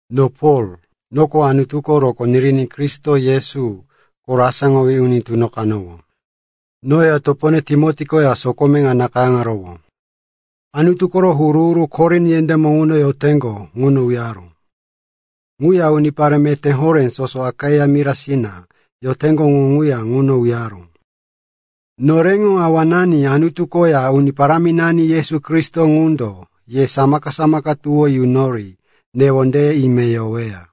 No Pol, noko Anutuko rokó niriní Kristo Yesu koro asáŋowí uni tunoqanowó. Noya topone Timoti koya sokome ŋa nakayáŋaro Anutu koro huru-huru Korin yendémo ŋuno yoteŋgo ŋuno uyaró. Ŋuya unipare meté horé soso Akaia mirasina yoteŋgo ŋu ŋuya ŋuno uyaró. Noreŋo Awanani Anutu koya Uni Paráminani Yesu Kristo ŋundo ye samaka-samaka tuwó yunori newondeye ime yoweya.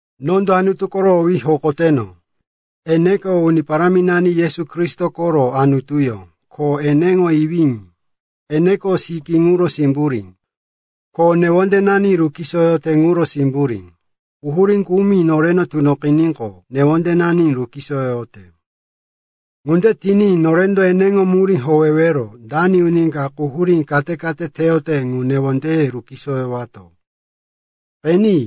Nondo Anutu koro owí hokoteno. Eneko Uni Paráminani Yesu Kristo koro Anutuyó ko eneŋo Iwí. Eneko sikí ŋuro simburí, ko newondenani rukisoyote ŋuro simburí. Quhurí kumi noreno tunoqiníqo, newondenani rukisoyoyote. Ŋunde tiní norendo eneŋo murí howero dani uni ka quhurí kate-kate teyote ŋu newondeye rukisoyoyowato. Qeni,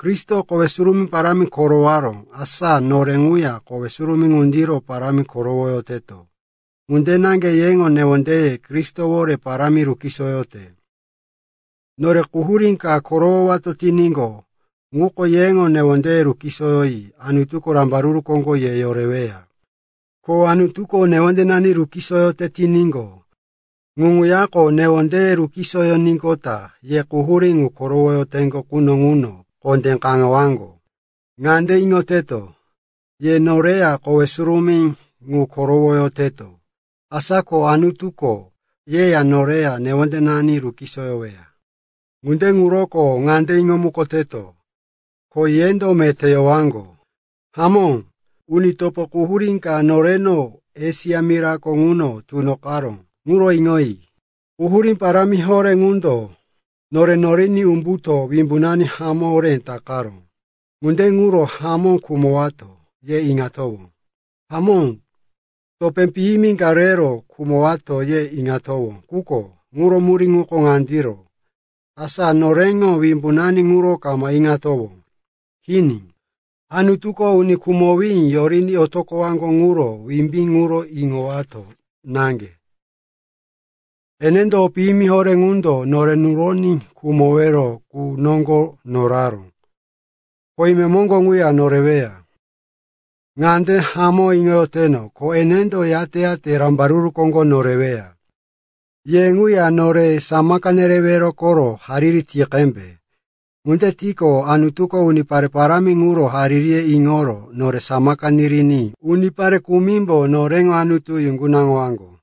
Kristoko kowe surumí parámi korowaró, asa nore ŋuya kowe surumí ŋundiro parámi korowoyoteto. Ŋunde naŋge yeŋo newondeye Kristowore parámi rukisoyoyoteto. Nore quhurí ka korowowato tiníqo, ŋuko yeŋo newondeye rukisoyoní Anutuko rambaruru koŋgo ye yoreweya. Ko Anutuko newondenani rukisoyoyote tiníqo, ŋu ŋuyako newondeye rukisoyoníqota ye quhurí ŋu korowoyoteŋgo quno ŋuno kondé kaŋewaŋgo. Ŋande iŋoteto, ye noreya kowe surumí ŋu korowoyoteto, asa ko Anutuko yeya noreya newondenani rukisoyoyoweya. Ŋunde ŋuroko ŋande iŋomukoteto, ko yendo meté yowaŋgo. Hamó, uni topo, quhurí ka noreno Esia mirako ŋuno tunoqaró ŋuro iŋoyi. Quhurí parámi horé ŋundo nore noriní umbuto wimbunani hamó horé takaró. Ŋunde ŋuro, hamó khumowato, ye iŋatowó. Hamó, topé piyimi ka rero khumowato, ye iŋatowó. Quko ŋuro murí ŋuko ŋandiro, asa noreŋo wimbunani ŋuro kama iŋowato. Kini, Anutuko uni khumowí yoriní otoqoyoteŋgo ŋuro wimbí ŋuro iŋowato naŋge. Enendo o piyimi horé ŋundo nore nuroní khumowero qu noŋgo noraró, ko imemoŋgo ŋuya noreweya. Ŋande hamó iŋoyoteto, ko enendo yate-yate rambaruru koŋgo noreyoweya. Ye ŋuya nore samaka nereweya koro hariri ti qembe. Ŋunde tiqo, Anutuko unipare parámi ŋuro haririye iŋoro nore samaka niriní unipare kumimbo noreŋo Anutu yuŋgunaŋowaŋgo.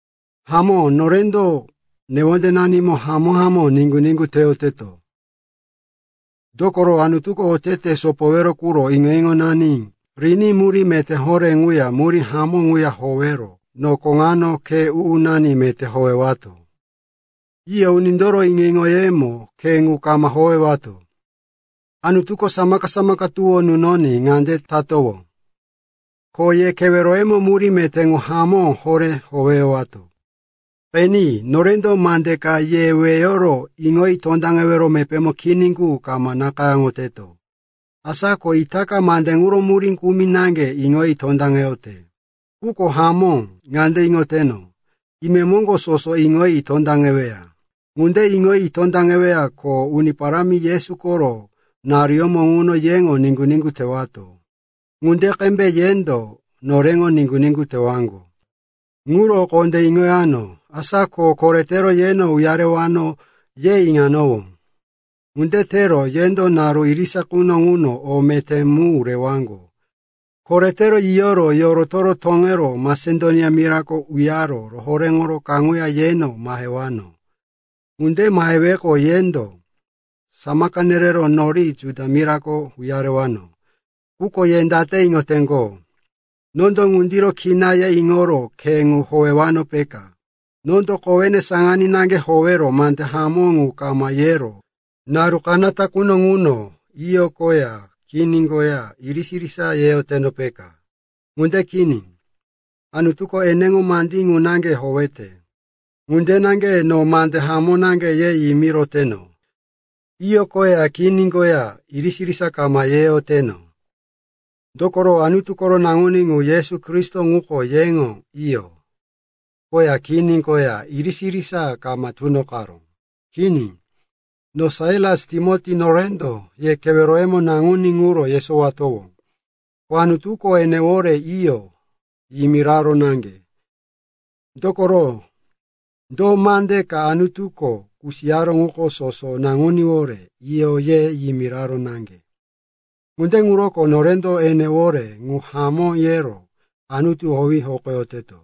Hamó, norendo newondenanimo hamó-hamó niŋgu-niŋgu teyoteto. Dokoro, Anutuko otete sopowero quro iŋo-iŋonani riní murí meté horé ŋuya murí hamó ŋuya howero nokono ŋano khe u-unani meté howeyato. Iyo, unindoro iŋo-iŋoyemo khe ŋu kama howeyato. Anutuko samaka-samaka tuwó nunoní ŋunde tatowó. Ko ye keweroyemo murí meté ŋu hamó horé howeyatowó. Qeni, norendo mande ka ye weyoro iŋoyi tondaŋewero mepémo kini qu kama nakayáŋoyoteto. Asa ko itaka mande ŋuro murí kumi naŋge iŋoyi tondaŋeyote. Quko hamó ŋande iŋoyoteno, imemoŋgo soso iŋoyi tondaŋeweya. Ŋande iŋoyi tondaŋeweya, ko Uni Parámi Yesu koro naruyómo ŋuno yeŋo niŋgu-niŋgu tewato, ŋunde qembe yendo noreŋo niŋgu-niŋgu tewaŋgo. Ŋuro kondé iŋoyano, asa ko, koretero yeno uyarewano, ye iŋanowó. Ŋunde tero yendo naru irisa quno ŋuno o meté mu rewaŋgo. Koretero yiyoro yoroto toŋero Masedonia mirako uyaro rohoréŋoro kaŋuya yeno mahewano. Ŋunde maheweqo, yendo samaka nerero nori Judia mirako uyarewano. Quko ye date iŋoteŋgo? Nondo ŋundiro kina ye iŋoro khe ŋu howewano, peka? Nondo kowene saŋaní naŋge howero mande hamó mu kama yero naru kanata quno ŋuno, “Iyo,” koya, “Kini,” koya irisa-irisa yeyoteno, peka? Ŋunde kini. Anutuko eneŋo mandí ŋu naŋge howeyote. Ŋunde naŋge no mande hamó naŋge ye yimiroyoteno; “Iyo,” koya, “Kini,” koya irisa-irisa kama yeyoteno. Dokoro Anutu koro Naŋuní ŋu, Yesu Kristo ŋuko yeŋo “Iyo” koya “Kini” koya irisa-irisa kama tunoqaró. Kini. No, Sailas, Timoti, norendo ye keweroyemo Naŋuní ŋuro yesowatowó, ko Anutuko enewore, “Iyo,” yimiraró naŋge. Dokoro do mande ka Anutuko kusiyaró ŋuko soso Naŋuníwore, “Iyo,” ye yimiraró naŋge. Ŋunde ŋuroko norendo enewore, “Ŋu hamó,” yero Anutu owí hokoyoteto.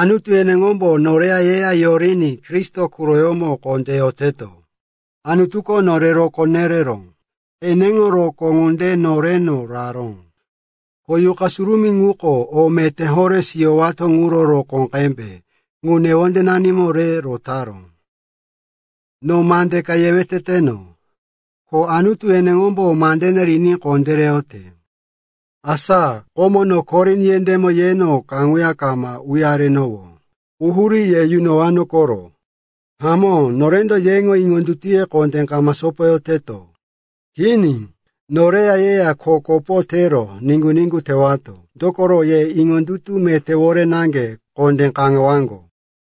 Anutu eneŋombo noreya yeya yoriní Kristo quroyómo kondé yoteto. Anutuko nore rokó yerero eneŋo rokóŋo ŋunde noreno raró, ko Yuqa Surumí ŋuko o meté horé siyowato ŋuro rokó qembe ŋu newondenanimo re rotaró. No mande ka yewe teteno, ko Anutu eneŋombo mandene riní kondéreyote, asa komo no Korin yendémo yeno kaŋuya kama uyarenowó, quhurí ye yunowano koro. Hamó, norendo yeŋo iŋondutuye kondé kama sopoyoteto. Kini, noreya yeya kho kopo tero niŋgu-niŋgu tewato. Dokoro ye iŋondutu metéwore naŋge kondé kaŋewaŋgo.